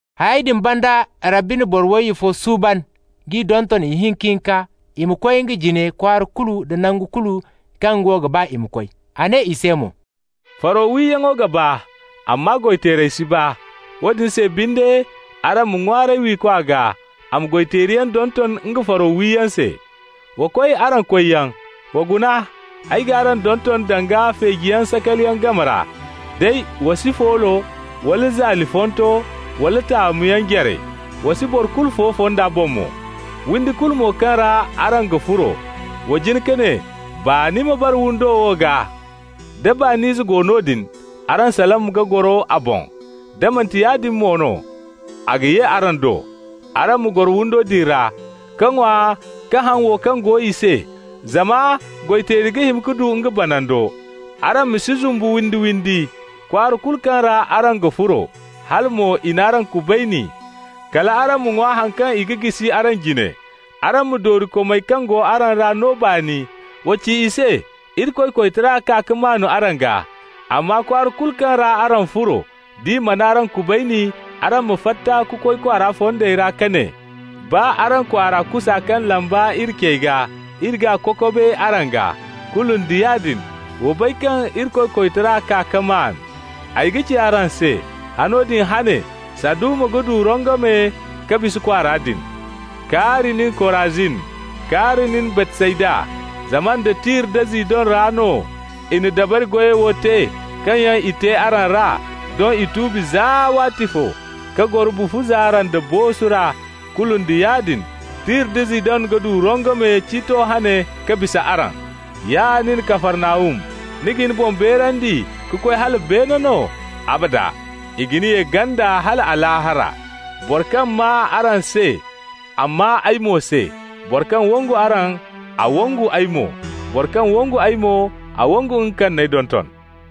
Hayey din banda Rabbi na boro wayye fo suuban k'i donton ihinka-hinka i ma koy nga jine kwaara kulu da nangu kulu kaŋ nga wo ga ba ka koy. A ne i se mo: «Faro wiyaŋo ga baa, amma goy-teerey si baa. Woodin se binde araŋ ma ŋwaaray wiikwa gaa, a ma goy-teeriyaŋ donton nga faro wiyaŋo se. Wa koy araŋ koyyaŋ. Wa guna, ay g'araŋ donton danga feejiyaŋ sakaliyaŋ game ra. Day wa si foolo, wala zalifonto, wala taamuyaŋ jare. Wa si boro kulu fo fonda boŋ mo. Windi kulu mo kaŋ ra araŋ ga furo, wa jin ka ne: ‹Baani ma bara windo wo gaa.› Da baani ize go noodin, araŋ salam ga goro a boŋ. Da manti yaadin mo no, a ga ye araŋ do. Araŋ ma goro windo din ra, ka ŋwa ka haŋ wo kaŋ go i se, zama goy-teeri ga hima ka du nga banando. Araŋ ma si zumbu windi-windi. Kwaara kulu kaŋ ra araŋ ga furo, hala mo i n'araŋ kubayni, kal araŋ ma ŋwa haŋ kaŋ i ga jisi araŋ jine. Araŋ ma doorikomey kaŋ go a ra no baani. Wa ci i se: ‹Irikoy koytara kaa ka maan araŋ gaa.› Amma kwaara kulu kaŋ ra araŋ furo, d'i mana araŋ kubayni, araŋ ma fatta ka koy kwaara fondey ra ka ne: ‹Baa araŋ kwaara kusa kaŋ lamba iri cey gaa, iri g'a kokobe araŋ gaa. Kulu nda yaadin wa bay kaŋ Irikoy koytara kaa ka maan.› Ay ga ci araŋ se: Hano din hane, Saduma ga du rongome ka bisa kwaara din. Kaari nin, Korazin! Kaari nin, Baytsayda! Zama nda Tir da Zidon ra no i na dabari goyey wo te kaŋ yaŋ i te araŋ ra, doŋ i tuubi za waatifo, ka goro bufu zaara nda boosu ra. Kulu nda yaadin, Tir da Zidon ga du rongome ciito hane ka bisa araŋ. Ya nin Kafarnahum, ni ga ni boŋ beerandi ka koy hala beene no? Abada! I ga ni ye ganda hala Alaahara. Boro kaŋ maa araŋ se, a maa ay mo se. Boro kaŋ wangu araŋ, a wangu ay mo. Boro kaŋ wangu ay mo, a wangu nga kaŋ n'ay donton.»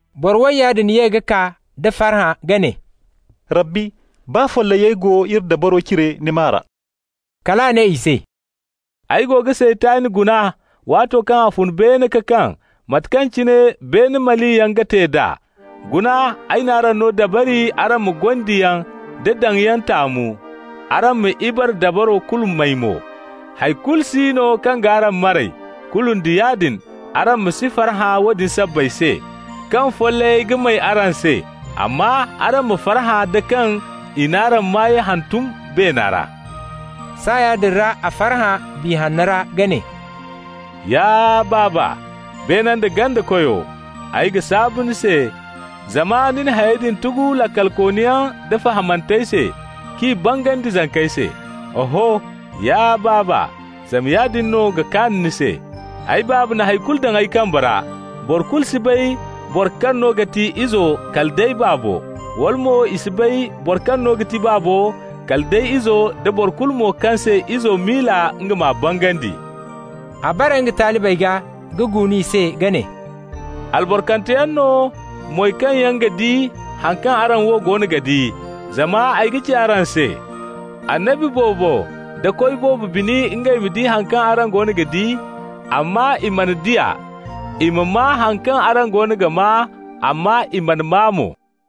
Boro wayya din ye ka kaa da farhã ka ne: «Rabbi, baa follayey go iri dabaro cire ni maa ra!» Kal a ne i se: «Ay go ga Saytan guna waato kaŋ a fun beene ka kaŋ, mate kaŋ cine beene maliyaŋ ga te d'a. Guna, ay n'araŋ no dabari araŋ ma gondiyaŋ da daŋyaŋ taamu, araŋ ma ibare dabaro kulu may mo. Hay kulu si no kaŋ g'araŋ maray. Kulu nda yaadin, araŋ ma si farhã woodin sabbay se, kaŋ follayey ga may araŋ se. Amma araŋ ma farhã da kaŋ i n'araŋ maayey hantum beena ra.» Saaya din ra a farhã Biya Hanna ra ka ne: «Ya Baaba, beene nda ganda Koyo, ay ga saabu ni se, zama ni na hayey din tugu laakalkooniyaŋ da fahamantey se, k'i bangandi zankey se. Oho, ya Baaba, zama yaadin no ga kaan ni se. Ay Baaba na hay kulu daŋ ay kambe ra. Boro kulu si bay boro kaŋ no ga ti Izo kala day Baabo, wala mo i si bay boro kaŋ no ga ti Baabo kala day Izo nda boro kulu mo kaŋ se Izo miila nga m'a bangandi.» A bare nga talibey gaa ka guunu i se ka ne: «Albarkanteyaŋ no moy kaŋ yaŋ ga di haŋ kaŋ araŋ wo goono ga di. Zama ay ga ci araŋ se: annabi boobo da koy boobo bini ngey ma di haŋ kaŋ araŋ goono ga di, amma i mana di a, i ma maa haŋ kaŋ araŋ goono ga maa, amma i mana maa mo.»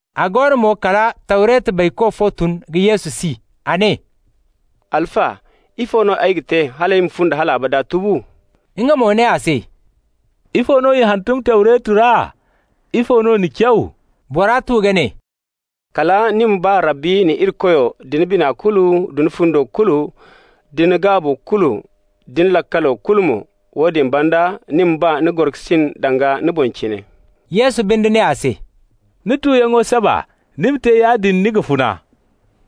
A go no mo kala Tawretu bayko fo tun ka Yesu si. A ne: «Alfa, ifo no ay ga te hal ay ma fundi hal abada tubu?» Nga mo ne a se: «Ifo no i hantum Tawreto ra? Ifo no ni caw?» Bora tu ka ne «Kala ‹ni ma ba Rabbi ni Irikoyo da ni bina kulu, da ni fundo kulu, da ni gaabo kulu, da ni laakalo kulu mo.› Woodin banda, ‹ni ma ba ni gorokasin danga ni boŋ cine.›» Yesu binde ne a se: «Ni tuyaŋo saba. Ni ma te yaadin, ni ga funa.»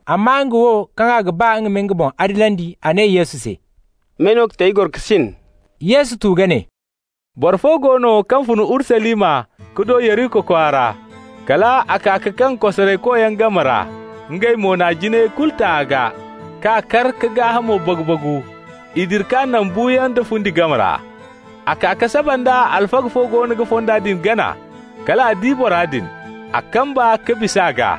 Amma nga wo, kaŋ a ga ba a ma nga boŋ adilandi, a ne Yesu se: «May no ga ti ay gorokasin?» Yesu tu ka ne: «Boro fo go no kaŋ fun Urusalima ka do Yeriko kwaara. Kal a kaa ka kaŋ kosaraykoyaŋ game ra. Ngey mo n'a jinayey kulu ta a gaa, k'a kar ka gaahamo bagu-bagu. I dira k'a naŋ buuyaŋ da fundi game ra. A kaa ka saba nda alfaga fo goono ga fonda din gana; kal a di bora din. A kamba ka bis'a gaa.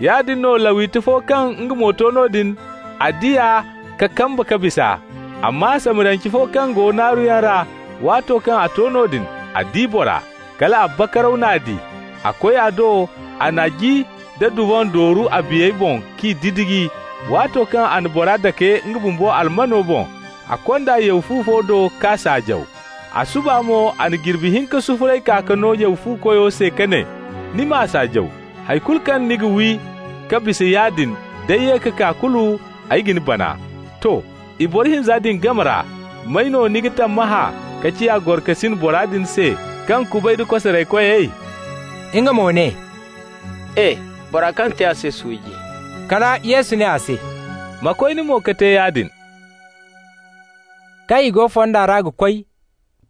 Yaadin no Lawiti fo kaŋ nga mo to noodin; a di a ka kamba ka bisa. Amma Samariyance fo kaŋ go naaruyaŋ ra, waato kaŋ a to noodin, a di bora. Kal a bakaraw n'a di. A koy a do, a na ji da duvan dooru a biyey boŋ k'i didiji. Waato kaŋ a na bora dake nga bumbo almano boŋ, a kond'a yaw fu fo do k'a saajaw. A suba mo a na jirbi hinka sufuray kaa ka no yaw fu koyo se ka ne: ‹Ni m'a saajaw. Hay kulu kaŋ ni ga wi ka bisa yaadin, d'ay ye ka kaa, kulu ay ga ni bana.› To. I boro hinza din game ra, may no ni ga tammahã ka ciya gorokasin bora din se kaŋ kubay da kosaraykoy?» Nga mo ne: «E! Bora kaŋ te a se suuji.» Kala Yesu ne a se: «Ma koy, ni mo, ka te yaadin.» Kaŋ i go fonda ra ga koy,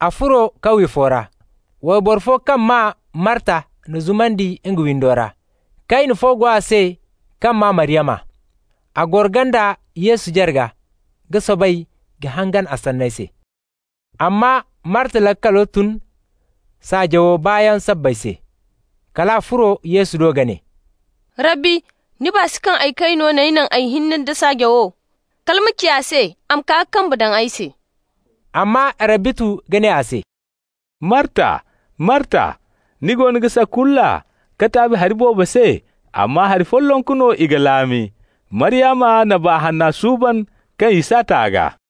a furo kawye fo ra. Wayboro fo kaŋ maa Marta n'a zumandi nga windo ra. Kayne fo go a se kaŋ maa Maryama. A goro ganda Yesu jarga ka soobay ka hangan a sanney se. Amma Marta laakalo tun saajawo baayaŋ sabbay se. Kal a furo Yesu do ka ne: «Rabbi, ni baa si kaŋ ay kayno n'ay naŋ ay hinne da saajawo? Kala ma ci a se a ma kaa ka kambe daŋ ay se.» Amma Rabbi tu ka ne a se: «Marta, Marta, ni goono ga sakulla ka taabi hari boobo se, amma hari follonku no i ga laami. Maryama na baa hanna suuban kaŋ i s'a ta a gaa.»